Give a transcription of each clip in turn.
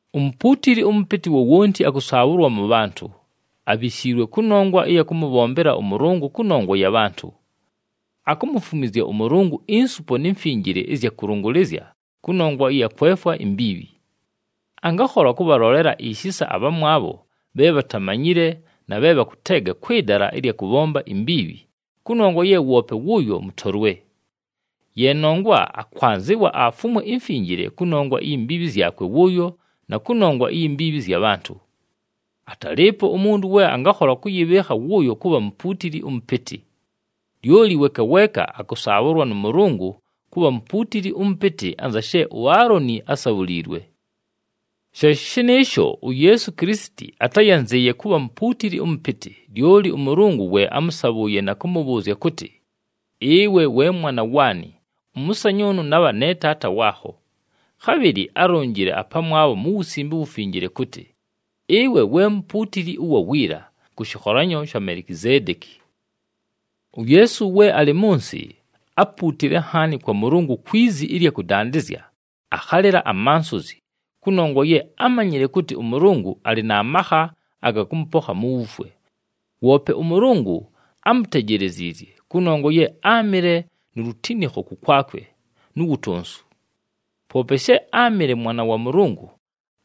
Umupuutili ʉmʉpɨtɨ wowonti akʉsaabhʉlwa mʉ bhantʉ, abhishiilwe kʉnongwa ɨya kʉmʉbhombela ʉMʉlʉngʉ kʉnongwa ya bhantʉ. Akumufumwizya ʉMʉlʉngʉ insupo ni mfinjile ɨzya kʉlʉngʉlɨzya kʉnongwa ɨya kwefwa imbiibhi. Angakhola kʉbhalolela ishisa abhamwabho bhe bhatamanyile na bhe bhakʉteega kwɨ dala ɨlya kʉbhomba imbiibhi, kʉnongwa ye woope wʉʉyo mʉtolwe. Ye nongwa akwanzɨwa afumwe imfinjile kʉnongwa iyi mbiibhi zyakwe wʉʉyo na kʉnongwa iyi mbiibhi zya bhantʉ. Atalɨɨpo umuntu we angakhola kʉyɨbhɨɨkha wʉʉyo kʉbha mupuutili ʉmʉpɨtɨ. Lyoli weeka weeka akʉsaabhʉlwa nʉ Mʉlʉngʉ kʉbha mupuutili ʉmʉpɨtɨ anza she uAaloni ásabhuliilwe. She shɨnɨɨsho, uYeesu Kilisiti atáyanzɨɨye kʉbha mupuutili ʉmʉpɨtɨ, lyoli ʉMʉlʉngʉ we ámʉsabhʉʉye na kʉmʉbhʉʉzya kʉtɨ, “Ɨwe we Mwana waanɨ, ʉmʉsanyʉʉnʉ nabha ne Taata waakho.” Khabhɨlɨ álonjile apamwabho mu Wusimbe uWufinjile kʉtɨ, “Ɨwe we mupuutili ʉwa wiila, kʉ shɨkholanyo sha Melikizeedeki.” UYeesu we alɨ mʉ nsɨ, ápuutile nhaani kwa Mʉlʉngʉ kwi zi ɨlya kʉdandɨzya, akhalɨla amansozi, kʉnongwa ye ámanyile kʉtɨ ʉMʉlʉngʉ alɨ na makha aga kʉmʉpokha mu wufwe. Woope ʉMʉlʉngʉ ámutejeleziizye kʉnongwa ye áamɨle nu lutinikho kʉkwakwe, nu wutonsu. Poope she áamɨle Mwana wa Mʉlʉngʉ,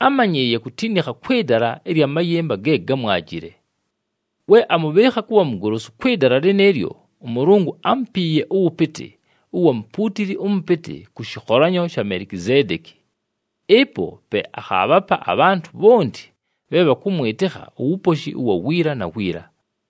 ámanyɨɨye kutinikha kwɨ dala ɨlya mayɨmba ge gámwajile. We amʉbhɨɨkha kʉbha mugolosu kwɨ dala lɨnɨɨlyo, ʉMʉlʉngʉ ámupiiye ʉwʉpɨtɨ ʉwa mupuutili ʉmʉpɨtɨ kʉ shɨkholanyo sha Melikizeedeki. Ɨpo pe akhaabhapa abhantʉ bhonti bhe bhakʉmwɨtɨkha uwuposhi ʉwa wiila na wiila.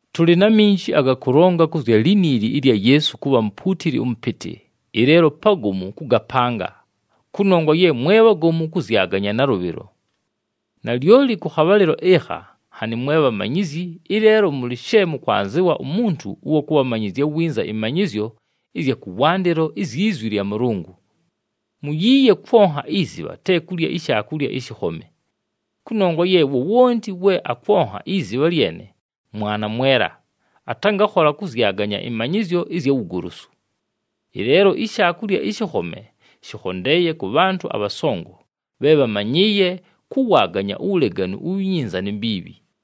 Tʉlɨ na minji aga kʉlonga kʉ zya liniili ɨlya Yeesu kʉbha mupuutili ʉmʉpɨtɨ, ɨleelo pagomu kʉgapanga, kʉnongwa ye mwe bhagomu kʉzyaganya nalʉbhɨlo. Nalyoli kʉ khabhalɨlo ɨkha nhanɨ mwe bhamanyizyi, ɨleelo mʉlɨ she mʉkwanzɨwa umuntu ʉwa kʉbhamanyɨzya winza ɨmanyɨzyo ɨzya kʉwandɨlo izyi zwi lya Mʉlʉngʉ. Muyiiye kwonha izibha, te kulya ishaakulya ɨshɨkhome. Kʉnongwa ye wowonti we akwonha izibha lyene, mwana mwela, atangakhola kʉzyaganya ɨmanyɨzyo ɨzya wugolosu. Ɨleelo ishaakulya ɨshɨkhome shɨkhondeeye kʉ bhantʉ abhasongo, bhe bhamanyɨɨye kʉwaaganya uwuleganu uwi nyinza ni mbiibhi.